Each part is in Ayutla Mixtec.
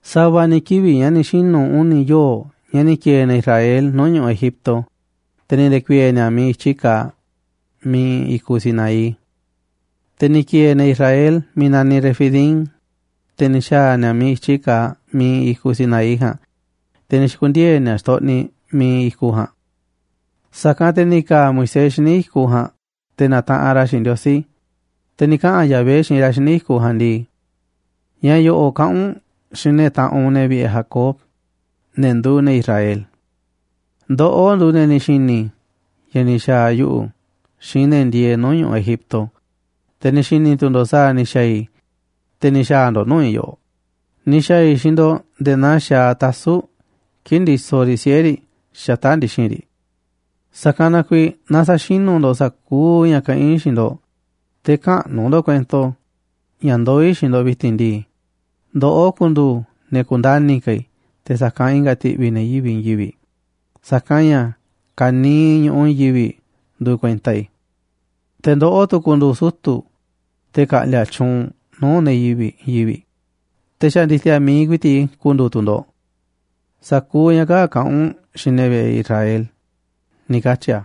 Sa̱va̱ ni̱ kivi̱ꞌ ña̱ ni̱ xinu̱ uni̱ yoo̱ꞌ ña̱ ni̱ ki̱e̱e̱ ne̱ Israel nuu̱ꞌ ñu̱ꞌuꞌ Egipto, te̱ ni̱ nde̱ku̱i̱e̱e̱ ni̱a̱ miiꞌ i̱tyi kaaꞌ, miiꞌ iinꞌ i̱kuꞌ Sinaí. Te̱ ni̱ ki̱e̱e̱ ne̱ Israel miiꞌ naniꞌ Refidim, te̱ ni̱ xa̱a̱ ni̱a̱ miiꞌ i̱tyi kaaꞌ miiꞌ iinꞌ i̱kuꞌ Sinaí ja̱a̱nꞌ, te̱ ni̱ xi̱ku̱ndiee̱ ni̱a̱ xtoꞌniꞌ miiꞌ iinꞌ i̱kuꞌ ja̱a̱nꞌ. Sa̱kanꞌ te̱ ni̱ ka̱a̱ Moisés xíniꞌ i̱kuꞌ ja̱a̱nꞌ te̱ na̱taꞌanꞌ ra̱ xiinꞌ Ndiosí, te̱ ni̱ kaꞌa̱n Yahvé xiinꞌ ra̱ xíniꞌ i̱kuꞌ ja̱a̱nꞌ ndii: ―Ña̱ yo̱ꞌo̱ꞌ kaꞌa̱n u̱nꞌ xiinꞌ ne̱ taꞌanꞌ u̱nꞌ, ne̱ vi̱ꞌe̱ Jacob, ne̱ nduuꞌ ne̱ Israel: “Ndoꞌó nduuꞌ ne̱ ni̱ xi̱ni̱ ña̱ ni̱ xa̱a̱ yuꞌu̱ xiinꞌ ne̱ ndieeꞌ nuu̱ꞌ ñu̱ꞌuꞌ Egipto, te̱ ni̱ xi̱ni̱ tu̱ ndo̱ꞌ sa̱a̱ ni̱ xa̱a̱ i̱, te̱ ni̱ xa̱a̱ ndo̱ꞌ nuu̱ꞌ i̱ yoꞌoꞌ, ni̱ xa̱a̱ i̱ xiinꞌ ndo̱ꞌ nde̱e̱ naa xaaꞌ tasu̱ꞌ kii̱ꞌ ndisoꞌ riꞌ siꞌe̱ riꞌ xata̱ꞌ ndi̱xi̱n riꞌ. Sa̱kanꞌ na kuiiꞌ naaꞌ sa̱xinu̱ ndo̱ꞌ sa̱kuuꞌ ña̱ kaꞌán i̱ xiinꞌ ndo̱ꞌ, te̱ käꞌnu̱ ndo̱ꞌ kuento ña̱ ndoó i̱ xiinꞌ ndo̱ꞌ vi̱ti̱n ndii. Ndoꞌó ku̱ndu̱u̱ ne̱ ku̱ndani ka̱ i̱ te̱ sa̱kanꞌ i̱nga̱ ti̱ꞌvi̱ ne̱ yivi̱ꞌ i̱i̱n yivi̱ꞌ, sa̱kanꞌ ña̱ ka̱niiꞌ ñu̱ꞌuꞌ i̱i̱n yivi̱ꞌ nduuꞌ kuenta i̱. Te̱ ndoꞌó tu̱ ku̱ndu̱u̱ sutu̱, te̱ ka̱ꞌndi̱a̱ tyuunꞌ nuu̱ꞌ ne̱ yivi̱ꞌ i̱i̱n yivi̱ꞌ, te̱ xa̱ ndi̱ti̱a̱ mi̱iꞌ ku̱i̱ti̱ꞌ i̱ ku̱ndu̱u̱ tu̱ ndo̱ꞌ”. Sa̱kuuꞌ ña̱ kaa̱ꞌ kaꞌa̱n u̱nꞌ xiinꞌ ne̱ vi̱ꞌe̱ Israel ―ni̱ katyi̱ a̱.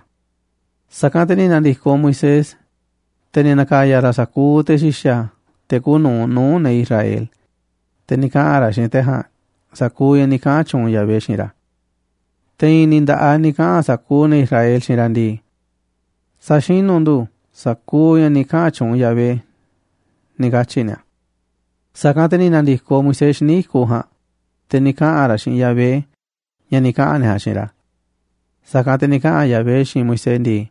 Sa̱kanꞌ te̱ ni̱ na̱ndi̱koꞌ Moisés, te̱ ni̱ na̱ka̱ya̱ ra̱ sa̱kuuꞌ te̱ xi̱xa̱, te̱ kuuꞌ nu̱uꞌ nuu̱ꞌ ne̱ Israel, te̱ ni̱ kaꞌa̱n ra̱ xiinꞌ te̱ ja̱a̱nꞌ sa̱kuuꞌ ña̱ ni̱ kaꞌa̱n tyuunꞌ Yahvé xiinꞌ ra̱. Te̱ i̱i̱n ni̱ nda̱ꞌaꞌ ni̱ kaꞌa̱n sa̱kuuꞌ ne̱ Israel xiinꞌ ra̱ ndii: ―Sa̱xinu̱ ndu̱ sa̱kuuꞌ ña̱ ni̱ kaꞌa̱n tyuunꞌ Yahvé ―ni̱ katyi̱ ni̱a̱. Sa̱kanꞌ te̱ ni̱ na̱ndi̱koꞌ Moisés xíniꞌ i̱kuꞌ ja̱a̱nꞌ, te̱ ni̱ kaꞌa̱n ra̱ xiinꞌ Yahvé ña̱ ni̱ kaꞌa̱n ne̱ ja̱a̱nꞌ xiinꞌ ra̱. Sa̱kanꞌ te̱ ni̱ kaꞌa̱n Yahvé xiinꞌ Moisés ndii: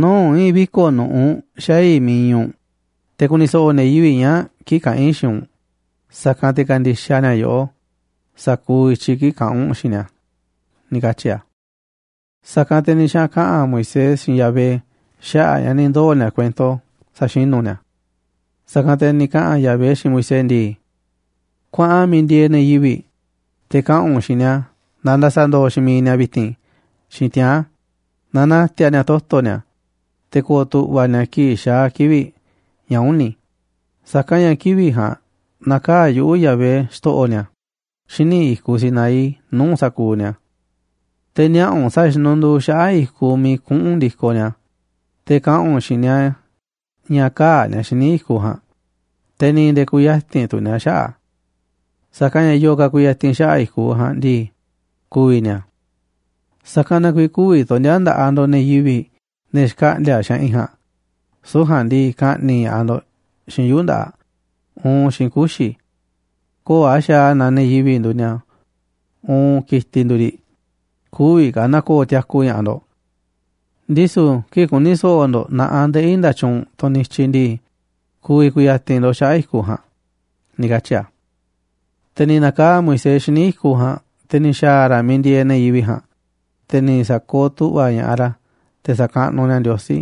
―Nuu̱ꞌ i̱i̱n viko̱ꞌ nu̱ꞌuꞌ xaa̱ i̱ miiꞌ iinꞌ u̱nꞌ te̱ ku̱ni̱ so̱ꞌo̱ ne̱ yivi̱ꞌ ñaa̱ꞌ kii̱ꞌ kaꞌa̱n i̱ xiinꞌ u̱nꞌ, sa̱kanꞌ te̱ ka̱ndi̱xaꞌ ni̱a̱ yoꞌó sa̱kuuꞌ i̱tyiꞌ kii̱ꞌ kaꞌa̱n u̱nꞌ xiinꞌ ni̱a̱ ―ni̱ katyi̱ a̱. Sa̱kanꞌ te̱ ni̱ xaꞌa̱n kaꞌa̱n Moisés xiinꞌ Yahvé xaꞌa̱ꞌ ña̱ ni̱ ndoo̱ ni̱a̱ kuento sa̱xinu̱ ni̱a̱. Sa̱kanꞌ te̱ ni̱ kaꞌa̱n Yahvé xiinꞌ Moisés ndii: ―Kuaꞌan miiꞌ ndieeꞌ ne̱ yivi̱ꞌ, te̱ kaꞌa̱n u̱nꞌ xiinꞌ ni̱a̱ na nda̱sa̱ndo̱o̱ xiinꞌ mi̱iꞌ ni̱a̱ vi̱ti̱n xiinꞌ tiaa̱n, na na̱ti̱a̱ ni̱a̱ toto̱ ni̱a̱, te̱ ko̱o̱ tu̱ꞌva̱ ni̱a̱ kii̱ꞌ xaa̱ kivi̱ꞌ ña̱ uni̱, sa̱kanꞌ ña̱ kivi̱ꞌ ja̱a̱nꞌ na̱kaa̱ꞌ yuꞌu̱, Yahvé, xto̱ꞌo̱ ni̱a̱, xíniꞌ i̱kuꞌ Sinaí nuu̱ꞌ sa̱kuuꞌ ni̱a̱. Te̱ niaꞌa̱ u̱nꞌ sa̱a̱ xinunduu xaꞌa̱ꞌ i̱kuꞌ miiꞌ kuꞌu̱n ndi̱koꞌ ni̱a̱, te̱ kaꞌa̱n u̱nꞌ xiinꞌ ni̱a̱ ña̱ kä̱a̱ ni̱a̱ xíniꞌ i̱kuꞌ ja̱a̱nꞌ, te̱ ni̱ nde̱e̱ kü̱ya̱ti̱n tu̱ ni̱a̱ xaꞌa̱ꞌ a̱. Sa̱kanꞌ ña̱ yo̱o̱ ka̱ ku̱ya̱ti̱n xaꞌa̱ꞌ i̱kuꞌ ja̱a̱nꞌ ndii, ku̱vi̱ ni̱a̱. Sa̱kanꞌ na kuiiꞌ kü̱vi̱ tondi̱a̱ nda̱ꞌaꞌ ndo̱ꞌ ne̱ yivi̱ꞌ, ne̱ xkaꞌndi̱a̱ xaꞌinꞌ ja̱a̱nꞌ, süu̱ꞌ ja̱a̱nꞌ ndii, ka̱ꞌni̱ꞌ ña̱ꞌaꞌ ndo̱ꞌ xiinꞌ yuu̱ꞌ nda̱ꞌaꞌ uun xiinꞌ kuxi̱. Köo̱ꞌ a̱ xaaꞌ a̱ naaꞌ ne̱ yivi̱ꞌ nduuꞌ ni̱a̱ uun ki̱tiꞌ nduuꞌ riꞌ, kü̱vi̱ ka̱ na̱ko̱o̱ tiaku ña̱ꞌaꞌ ndo̱ꞌ. Ndisu̱ kii̱ꞌ ku̱ni̱ so̱ꞌo̱ ndo̱ꞌ na̱ꞌaꞌ ndeꞌí nda̱tyuunꞌ, tunꞌ nityiꞌ ndii, ku̱vi̱ ku̱ya̱ti̱n ndo̱ꞌ xaꞌa̱ꞌ i̱kuꞌ ja̱a̱nꞌ ―ni̱ katyi̱ a̱. Te̱ ni̱ na̱kaa̱ꞌ Moisés xíniꞌ i̱kuꞌ ja̱a̱nꞌ, te̱ ni̱ xa̱a̱ ra̱ miiꞌ ndieeꞌ ne̱ yivi̱ꞌ ja̱a̱nꞌ, te̱ ni̱ sa̱kooꞌ tu̱ꞌva̱ ña̱ꞌaꞌ ra̱ te̱ sa̱kaꞌnuꞌ ni̱a̱ Ndiosí,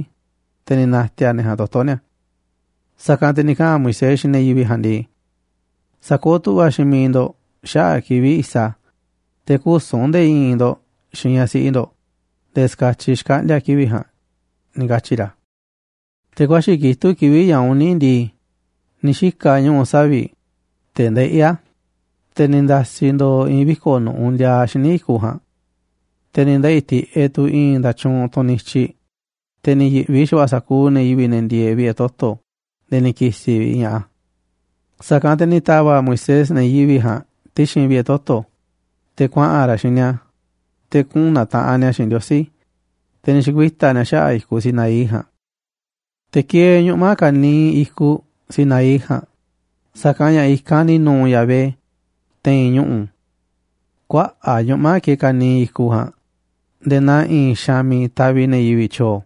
te̱ ni̱ na̱ti̱a̱ ne̱ ja̱a̱nꞌ toto̱ ni̱a̱. Sa̱kanꞌ te̱ ni̱ kaꞌa̱n Moisés xiinꞌ ne̱ yivi̱ꞌ ja̱a̱nꞌ ndii: ―Sa̱kooꞌ tu̱ꞌva̱ xiinꞌ mi̱iꞌ ndo̱ꞌ xaꞌa̱ꞌ kivi̱ꞌ i̱sa, te̱ küsu̱n nde̱e̱ i̱i̱n ndo̱ꞌ xiinꞌ ñaꞌ siꞌi ndo̱ꞌ nde̱e̱ ska̱tyiꞌ xkaꞌndi̱a̱ kivi̱ꞌ ja̱a̱nꞌ ―ni̱ katyi̱ ra̱. Te̱ ku̱a̱xi̱ kitúꞌ kivi̱ꞌ ña̱ uni̱ ndii, ni̱ xika̱ ñuꞌu̱ savi̱ꞌ, te̱ ndeꞌí a̱, te̱ ni̱ nda̱si̱ ndo̱o̱ i̱i̱n viko̱ꞌ nu̱ꞌuꞌ ndiaaꞌ xíniꞌ i̱kuꞌ ja̱a̱nꞌ. Te̱ ni̱ ndeꞌi̱ tiꞌeꞌ tu̱ i̱i̱n nda̱tyuunꞌ, tunꞌ nityiꞌ, te̱ ni̱ yi̱ꞌvi xa̱va̱ꞌa̱ sa̱kuuꞌ ne̱ yivi̱ꞌ ne̱ ndieeꞌ vi̱ꞌe̱ toto̱ nde̱e̱ ni̱ ki̱si̱ vi̱ꞌ ña̱ꞌaꞌ a̱. Sa̱kanꞌ te̱ ni̱ ta̱va̱ꞌ Moisés ne̱ yivi̱ꞌ ja̱a̱nꞌ ti̱xi̱n vi̱ꞌe̱ toto̱, te̱ kuaꞌa̱n ra̱ xiinꞌ ni̱a̱, te̱ kuꞌu̱n na̱taꞌanꞌ ni̱a̱ xiinꞌ Ndiosí, te̱ ni̱ xi̱kuita̱ ni̱a̱ xaꞌa̱ꞌ i̱kuꞌ Sinaí ja̱a̱nꞌ. Te̱ kieeꞌ ñuꞌma̱ ka̱niiꞌ i̱kuꞌ Sinaí ja̱a̱nꞌ, sa̱kanꞌ ña̱ i̱kanꞌ ni̱ nu̱u̱ Yahvé te̱i̱n ñuꞌu̱. Kuaꞌa̱ꞌ ñuꞌma̱ kieeꞌ ka̱niiꞌ i̱kuꞌ ja̱a̱nꞌ nde̱e̱ naa i̱i̱n xaanꞌ miiꞌ taviꞌ ne̱ yivi̱ꞌ tyo̱o̱,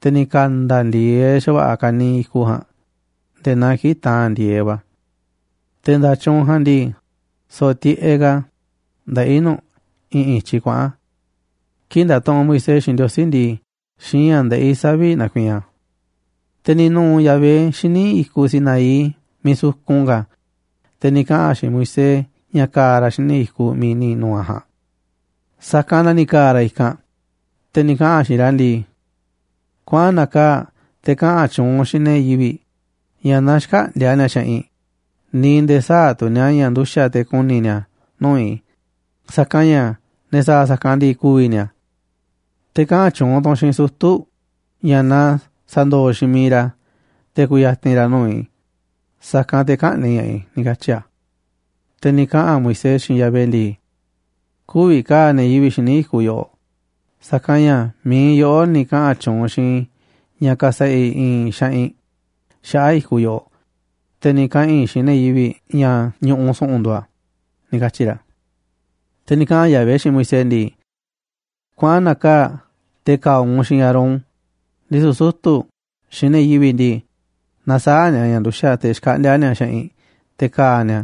te̱ ni̱ ka̱nda̱ ndi̱e̱eꞌ xa̱va̱ꞌa̱ ka̱niiꞌ i̱kuꞌ ja̱a̱nꞌ nde̱e̱ naa kii̱ꞌ taa̱n ndi̱e̱eꞌ va̱. Te̱ nda̱tyuunꞌ ja̱a̱nꞌ ndii, so̱ꞌo̱ tiꞌeꞌ ka̱ ndeꞌí nu̱ꞌ i̱ꞌi̱n i̱tyiꞌ kuaꞌa̱n. Kii̱ꞌ ndatuꞌunꞌ Moisés xiinꞌ Ndiosí ndii, xiinꞌ ña̱ ndeꞌí savi̱ꞌ nakuiinꞌ a̱. Te̱ ni̱ nu̱u̱ Yahvé xíniꞌ i̱kuꞌ Sinaí miiꞌ sukun ka̱, te̱ ni̱ kaꞌa̱n a̱ xiinꞌ Moisés ña̱ ka̱a̱ ra̱ xíniꞌ i̱kuꞌ miiꞌ ni̱ nu̱u̱ a̱ ja̱a̱nꞌ. Sa̱kanꞌ na ni̱ ka̱a̱ ra̱ i̱kanꞌ, te̱ ni̱ kaꞌa̱n a̱ xiinꞌ ra̱ ndii: ―Kuaꞌan na̱kaa̱ꞌ te̱ kaꞌa̱n tyuunꞌ u̱nꞌ xiinꞌ ne̱ yivi̱ꞌ ña̱ na xkäꞌndi̱a̱ ni̱a̱ xaꞌinꞌ, ni̱ nde̱e̱ sä̱a̱ tu̱ ni̱a̱ ña̱ nduxa̱ꞌ te̱ ku̱ni̱ ni̱a̱ nuu̱ꞌ i̱, sa̱kanꞌ ña̱ ne̱ sa̱a̱ sa̱kanꞌ ndii, ku̱vi̱ ni̱a̱. Te̱ kaꞌa̱n tyuunꞌ tu̱ u̱nꞌ xiinꞌ sutu̱ ña̱ na sa̱ndo̱o̱ xiinꞌ mi̱iꞌ ra̱, te̱ ku̱ya̱ti̱n ra̱ nuu̱ꞌ i̱, sa̱kanꞌ te̱ kä̱ꞌni̱ꞌ ña̱ꞌaꞌ i̱ ―ni̱ katyi̱ a̱. Te̱ ni̱ kaꞌa̱n Moisés xiinꞌ Yahvé ndii: ―Kü̱vi̱ ka̱a̱ ne̱ yivi̱ꞌ xíniꞌ i̱kuꞌ yoꞌoꞌ, sa̱kanꞌ ña̱ mi̱iꞌ yoꞌó ni̱ kaꞌa̱n tyuunꞌ xiinꞌ i̱ ña̱ ka̱sa̱ꞌa̱ i̱ i̱i̱n xaꞌinꞌ xaꞌa̱ꞌ i̱kuꞌ yoꞌoꞌ, te̱ ni̱ kaꞌa̱n i̱ xiinꞌ ne̱ yivi̱ꞌ ña̱ ñu̱ꞌuꞌ su̱ꞌu̱n nduuꞌ a̱ ―ni̱ katyi̱ ra̱. Te̱ ni̱ kaꞌa̱n Yahvé xiinꞌ Moisés ndii: ―Kuaꞌan, na̱kaa̱ꞌ te̱ ka̱a̱ u̱nꞌ xiinꞌ Aarón, ndisu̱ sutu̱ xiinꞌ ne̱ yivi̱ꞌ ndii, na sä̱a̱ ni̱a̱ ña̱ nduxa̱ꞌ te̱ xkaꞌndi̱a̱ ni̱a̱ xaꞌinꞌ te̱ ka̱a̱ ni̱a̱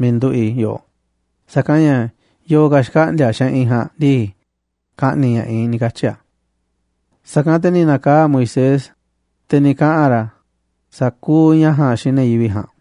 miiꞌ nduꞌu̱ꞌ i̱ yoꞌoꞌ, sa̱kanꞌ ña̱ yo̱o̱ ka̱ xkaꞌndi̱a̱ xaꞌinꞌ ja̱a̱nꞌ ndii, ka̱ꞌni̱ꞌ ña̱ꞌaꞌ i̱ ―ni̱ katyi̱ a̱. Sa̱kanꞌ te̱ ni̱ na̱kaa̱ꞌ Moisés, te̱ ni̱ kaꞌa̱n ra̱ sa̱kuuꞌ ña̱ ja̱a̱nꞌ xiinꞌ ne̱ yivi̱ꞌ ja̱a̱nꞌ.